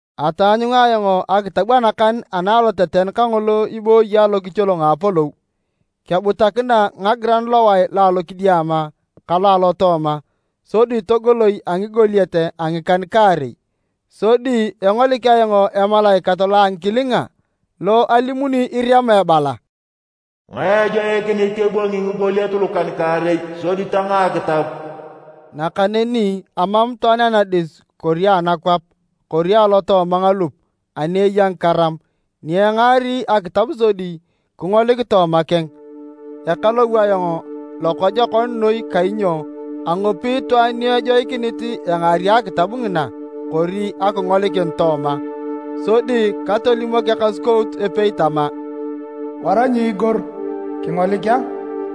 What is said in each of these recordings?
Ataanyunga ayong akitab anakan ana aloteten kangolo ibooyi alokicholong a apolou, kebutakina ngagiran lowae lo alokidiama ka lo alotooma sodi togoloi a ngigoliet a ngikan-kaarei. Sodi engolik ayong emalaikat lo a ngikilinga, lo alimuni irema ebala, “Ngae ejoikinit ebwangi ngigoliet lukan-kaarei sodi tangaa akitab?” Nakaneni amam itwaan anadis kori anakwap kori alotooma ngalup ani eya ngikaram ni engaari akitab sodi kingolik tooma keng. Ekalou ayong lokojokon noi kainyo angopi itwaan ni ejoikinit engaari akitab ngina kori akingolikin tooma. Sodi katolimok ekasukout epei tama, “Wara nyiigor. Kingolik a!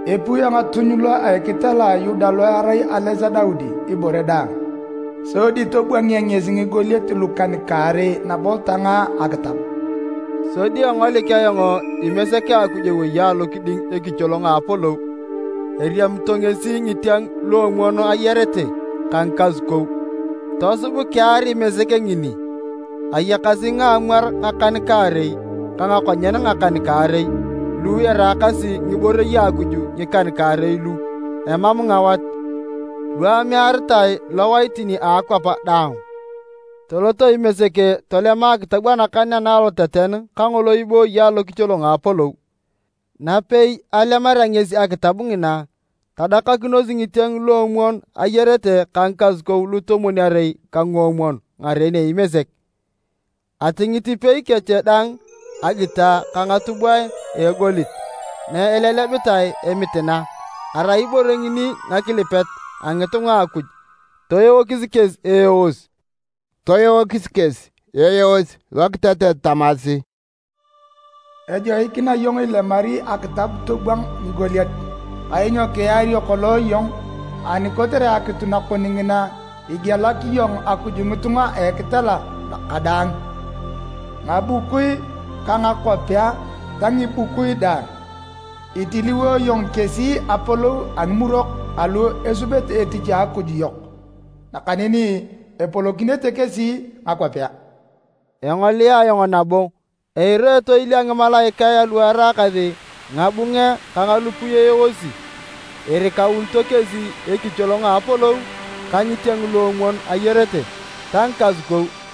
Epiu engatuny lo a ekitela a Yuda lo erai ales a Daudi, ibore daang, sodi tobwangea ngesi ngigoliet lukan-kaarei nabo tangaa akitab.” Sodi engolik ayong Imesek a Akuj ewei alokiding ekicholong a apolou, eriamito ngesi ngitieng luomwon ayarete ka ngikasukou. Tosub kear Imesek ngini. Ayakasi ngaamwar ngakan-kaarei ka ngakonyen ngakan-kaarei, lu eraakasi ngiborei a Akuj ngikan-kaarei lu emam ngawat, lu amearitae lowaitin a akwap daang. Tolot Imesek tolema akitab anakan ana aloteten kangolo ibooyi alokicholong a apolou. Napei alemarea ngesi akitab ngina, tadakakinos ngitieng luomwon ayarete ka ngikasukou lutomwon-arei ka nguomwon ngaren Imesek. Atingit ipei kech daang agita ka ngatubwae a egolit na elelebitae emitina, arai ibore ngini ngakilipet a ngitunga a Akuj. Toeokis kesi eeos lokitetet tamasi: “Ejoikina iyong ilemari akitab tobwang ngigoliet. Kainyo kiario kolong iyong, ani kotere akitu nakon ngina igielak iyong Akuj ngitunga a ngitela kadaang, ngabukui ka ngakwapea ta ngibukui daang. Itiliwo iyong kesi apolou a ngimurok alu esubete etich a Akuj yok, nakaneni epolokinete kesi ngakwapea.” Engolia ayong nabo, eira etoil a ngimalaikae alu eraakasi ngabunge ka ngalupui eeosi! Erikaunito kesi ekicholong a apolou ka ngitieng luomwon ayarete ta ngikasukou.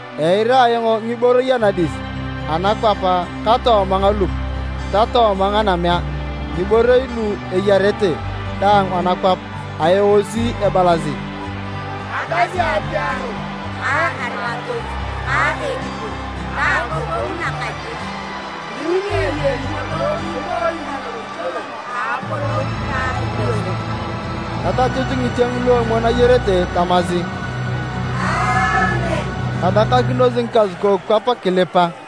Eira ayong ngiborei anadis, anakwap ka tooma ngalup ta tooma nganamea, ngiborei lu eyarete daang anakwap, aeosi ebalasi, “Agasi apiaro ka arimatoi ka ekipur ta agogongu nakajik, min ni eyei ngolo ibooyi alokicholong a apolou ka Imesek!” Tatachut ngitieng luomwon ayarete tamasi, “Aamen!” Tadakakinos ngikasukou kwap kilipa.